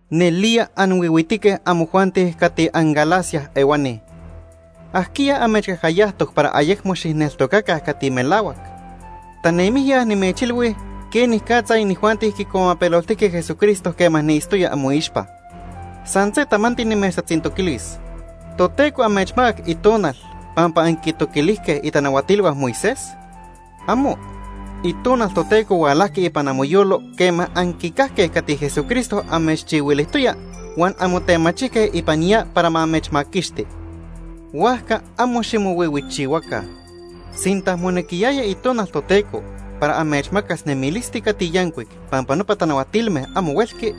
¡Nelía anhuihuitique amojuanti cati anGálata ehuani! ¿Ajquiya amechcajcayajtoc para ayecmo xijneltocaca cati melahuac? Tanemijya nimechilhui quenicatza inijuanti quicuamapeloltijque Jesucristo quema niitztoya amoixpa. San se tamanti nimechtatzintoquilis. ¿Toteco amechmacac Itonal pampa anquintoquilijque itanahuatilhua Moisés? ¡Amo! Itonal Toteco hualajqui ipan amoyolo quema anquicajque cati Jesucristo amechchihuilijtoya huan anmotemachijque ipan ya para ma amechmaquixti. Huajca amo ximohuihuichihuaca. Sinta monequiyaya Itonal Toteco para amechmacas nemilisti cati yancuic pampa nopa tanahuatilme amo huelqui,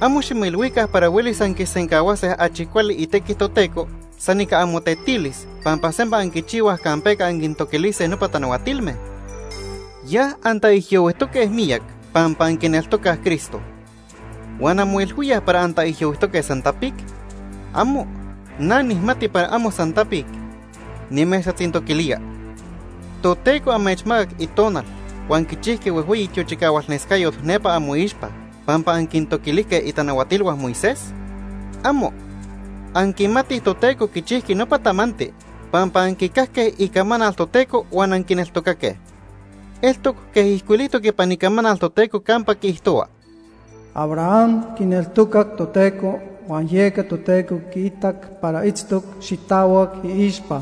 amo ximoilhuica para huelis anquisencahuase achi cuali itequi Toteco san ica amotetilis pampa sempa anquichihuaj campeca anquintoquilise nopa tanahuatilme. Ya antaijyohuijtoque miyac pampa anquineltocaj Cristo. ¿Huan anmoilhuíaj para antaijyohuijtoque san tapic? ¡Amo! Na nijmati para amo san tapic. Nimechtatzintoquilía: ¿Toteco amechmacac Itonal huan quichijqui huejhueyi tiochicahualnescayot nepa amoixpa pampa anquintoquilijque itanahuatilhua Moisés? ¡Amo! Anquimatij Toteco quichijqui nopa tamanti pampa anquicajque icamanal Toteco huan anquineltocaque. Eltoc quej ijcuilijtoc ipan Icamanal Toteco campa quiijtohua: “Abraham quineltocac Toteco, huan yeca Toteco quiitac para itztoc xitahuac iixpa.”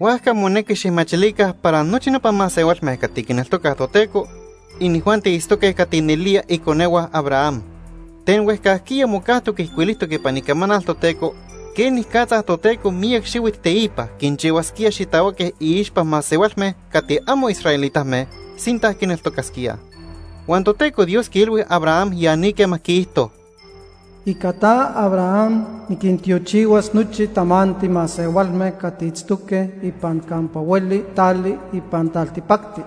Huajca monequi xijmachilica para nochi nopa masehualme cati quineltocaj Toteco, inijuanti itztoque cati nelía iconehua Abraham. Ten huejcajquiya mocajtoc ijcuilijtoc ipan Icamanal Toteco quenicatza Toteco miyac xihuit teipa quinchihuasquía xitahuaque iixpa masehualme cati amo israelitame sinta quineltocasquíaj. Huan Toteco Dios quiilhui Abraham ya ni quema quiijto: “Ica ta, Abraham, niquintiochihuas nochi tamanti masehualme cati itztoque ipan campa hueli tali ipan taltipacti.”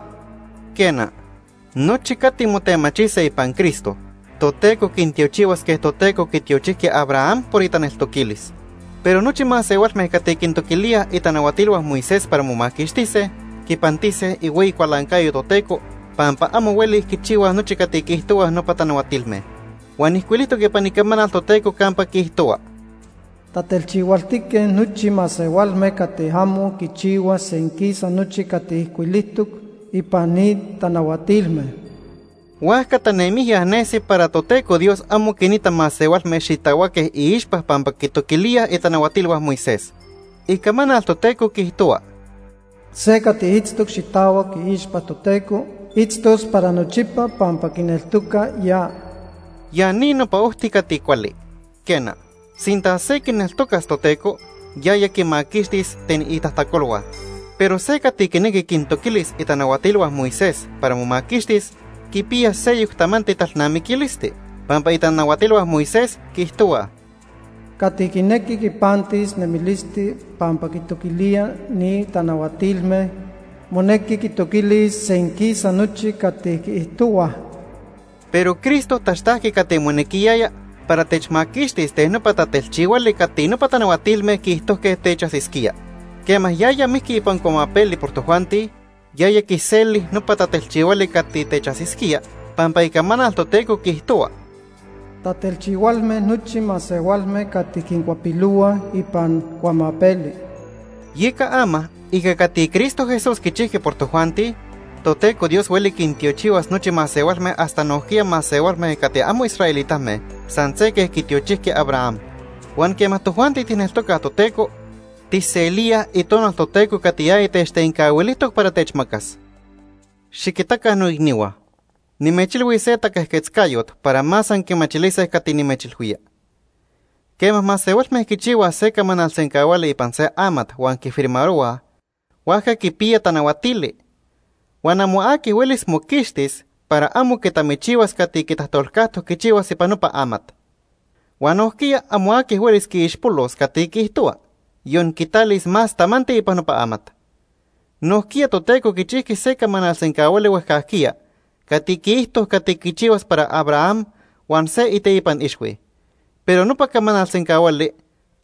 Quena, nochi cati motemachise ipan Cristo, Toteco quintiochihuas quej Toteco quitiochijqui Abraham por itaneltoquilis. Pero nochi masehualme cati quintoquilíaj itanahuatilhua Moisés para momaquixtise, quipantise ihueyi cualancayo Toteco pampa amo huelij quichihuaj nochi cati quiijtohuaj nopa tanahuatilme. Huan ijcuilijtoc ipan Icamanal Toteco campa quiijtohua: “Tatelchihualtique nochi masehualme cati amo quichihuaj senquisa nochi cati ijcuilijtoc ipan ni tanahuatilme.” Huajca tanemijya nesi para Toteco Dios amo quinita masehualme xitahuaque iixpa pampa quitoquilíaj itanahuatilhua Moisés. Icamanal Toteco quiijtohua: “Se cati itztoc xitahuac iixpa Toteco, itztos para nochipa pampa quineltoca ya.” Ya ni nopa ojti cati cuali. Quena, sinta se quineltocas Toteco, yaya quimaquixtis ten itajtacolhua. Pero se cati quinequi quintoquilis itanahuatilhua Moisés para momaquixtis quipiya seyoc tamanti talnamiquilisti. Pampa itanahuatilhua Moisés quiijtohuaj: “Cati quinequi quipantis nemilisti pampa quintoquilía ni tanahuatilme, monequi quitoquilis senquisa nochi cati quiijtohuaj.” Pero Cristo taxtajqui cati monequiyaya para techmaquixtis ten nopa tatelchihuali cati nopa tanahuatilme quiijtojque techajsisquía. Quema yaya mijqui ipan cuamapeli por tojuanti, yaya quiseli nopa tatelchihuali cati techajsisquía, pampa Icamanal Toteco quiijtohua: “Tatelchihualme nochi masehualme cati quincuapilohuaj ipan cuamapeli.” Yeca ama ica cati Cristo Jesús quichijqui por tojuanti, Toteco Dios hueli quintiochihuas nochi masehualme hasta nojquiya masehualme cati amo israelitame san se quej quitiochijqui Abraham. Huan quema tojuanti tijneltocaj Toteco, tijselíaj Itonal Toteco cati yaya techtencahuilijtoc para techmacas. Xiquitaca noicnihua. Nimechilhuis se taquejquetzcayot para más anquimachilise cati nimechilhuía. Quema masehualme quichihuaj se camanal sencahuali ipan se amat huan quifirmarohuaj, huajca quipiya tanahuatili. Huan amo aqui huelis moquixtis para amo quitamichihuas cati quitajtolcajtoc quichihuas ipan nopa amat. Huan nojquiya amo aqui huelis quiixpolos cati quiijtohua, yon quitalis más tamanti ipan nopa amat. Nojquiya Toteco quichijqui se camanal sencahuali huejcajquiya cati quiijto cati quichihuas para Abraham huan se iteipan ixhui. Pero nopa camanal sencahuali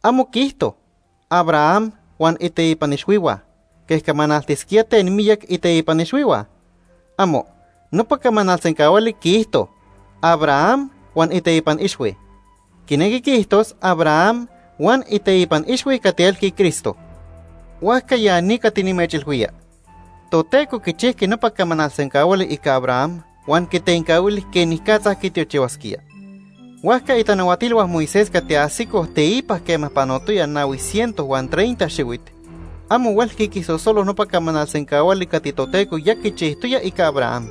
amo quiijto: “Abraham huan iteipan ixhuihua”, quej camanaltisquía ten miyac iteipan ixhuihua. ¡Amo! Nopa camanal sencahuali quiijto: “Abraham huan iteipan ixhui.” Quinequi quiijtos Abraham huan iteipan ixhui cati elqui Cristo. Huajca ya ni cati nimechilhuía: Toteco quichijqui nopa camanal sencahuali ica Abraham huan quitencahuili quenicatza quitiochihuasquía. Huajca itanahuatilhua Moisés cati ajsicoj teipa quema panotoya nahui ciento huan treinta xihuit, amo huelqui quisosolo nopa camanal sencahuali cati Toteco ya quichijtoya ica Abraham.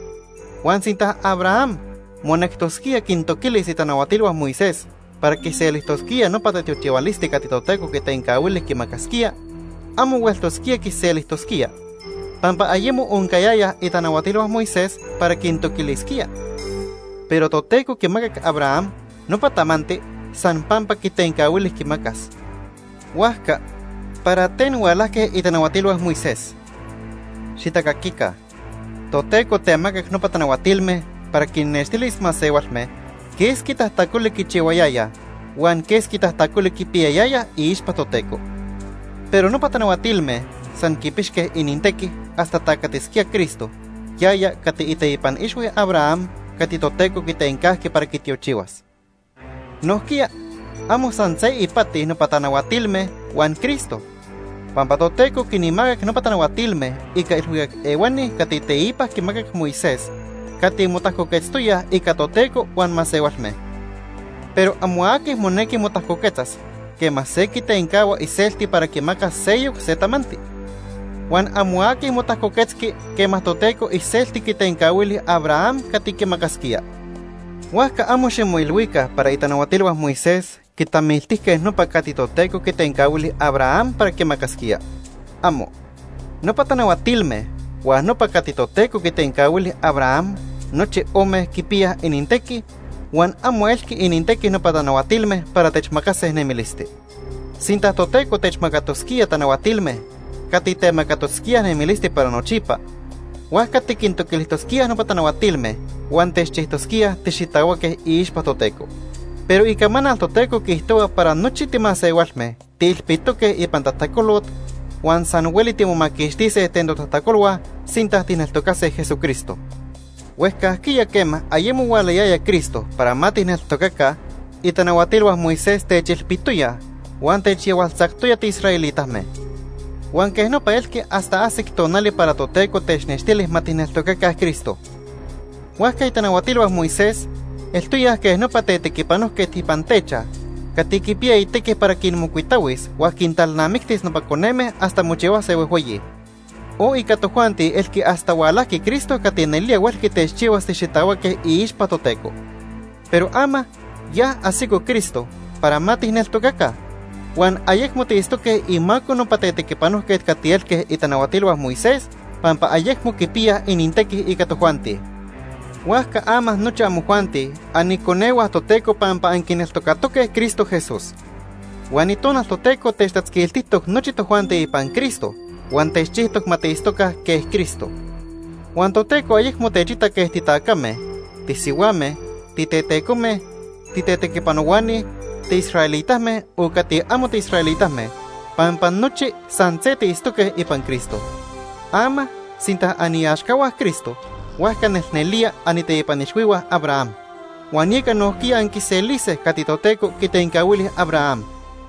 Huan sinta Abraham monectosquía quintoquilis itanahuatilhua Moisés para quiselijtosquía nopa tatiochihualisti cati Toteco quitencahuili quimacasquía, amo hueltosquía quiselijtosquía, pampa ayemo oncayayaj itanahuatilhua Moisés para quintoquilisquía. Pero Toteco quimacac Abraham nopa tamanti san pampa quitencahuili quimacas. Huajca, ¿para ten hualajque itanahuatilhua Moisés? ¡Xitacaquica! Toteco temacac nopa tanahuatilme para quinnextilis masehualme quesqui tajtacoli quichihuayayaj huan quesqui tajtacoli quipiyayayaj iixpa Toteco. Pero nopa tanahuatilme san quipixque inintequi hasta tacatisquía Cristo, yaya cati iteipan ixhui Abraham cati Toteco quitencajqui para quitiochihuas. Nojquiya amo san se ipati nopa tanahuatilme huan Cristo. Pampa Toteco quinmacac nopa tanahuatilme ica ilhuicac ehuani cati teipa quimacac Moisés cati motajcoquetztoyaj ica Toteco huan masehualme. Pero amo aqui monequi motajcoquetzas quema se quitencahua iselti para quimacas seyoc se tamanti. Huan amo aqui motajcoquetzqui quema Toteco iselti quitencahuili Abraham cati quimacasquía. Huajca amo ximoilhuica para itanahuatilhua Moisés quitamiltijque nopa cati Toteco quitencahuili Abraham para quimacasquía. ¡Amo! Nopa tanahuatilme huan nopa cati Toteco quitencahuili Abraham, nochi ome quipiyaj inintequi, huan amo elqui inintequi nopa tanahuatilme para techmacas nemilisti. Sinta Toteco techmacatosquía tanahuatilme cati temacatosquíaj nemilisti para nochipa, huajca tiquintoquilijtosquíaj nopa tanahuatilme, huan techchijtosquíaj tixitahuaque iixpa Toteco. Pero Icamanal Toteco quiijtohua para nochi timasehualme tiilpitoque ipan tajtacolot, huan san hueli timomaquixtise ten totajtacolhua sinta tijneltocase Jesucristo. Huejcajquiya quema ayemo hualayaya Cristo para ma tijneltocaca, itanahuatilhua Moisés techilpitoyaj huan techyahualtzactoya tiisraelitame. Huan quej nopa elqui hasta ajsic tonali para Toteco technextili ma tijneltocaca Cristo. Huajca itanahuatilhua Moisés eltoyaj quej nopa tetequipanojquet ipan techaj cati quipiya itequi para quinmocuitahuis huan quintalnamictis nopa coneme hasta mochihuase huejhueyi; o ica tojuanti elqui hasta hualajqui Cristo cati nelía huelqui techchihuas tixitahuaque iixpa Toteco. Pero ama, ya ajsico Cristo para ma tijneltocaca, huan ayecmo tiitztoque imaco nopa tetequipanojquet cati elque itanahuatilhua Moisés, pampa ayecmo quipiyaj inintequi ica tojuanti. Huajca ama nochi amojuanti aniconehua Toteco pampa anquineltocatoque Cristo Jesús. Huan Itonal Toteco techtatzquiltijtoc nochi tojuanti ipan Cristo, huan techchijtoc ma tiitztoca quej Cristo. Huan Toteco ayecmo techita quej titacame, tisihuame, titetecome, titetequipanohuani, tiisraelitame, o cati amo tiisraelitame, pampa nochi san se tiitztoque ipan Cristo. Ama sinta aniaxcahua Cristo, huajca nelnelía aniteipan ixhuihua Abraham. Huan yeca nojquiya anquiselise cati Toteco quitencahuili Abraham.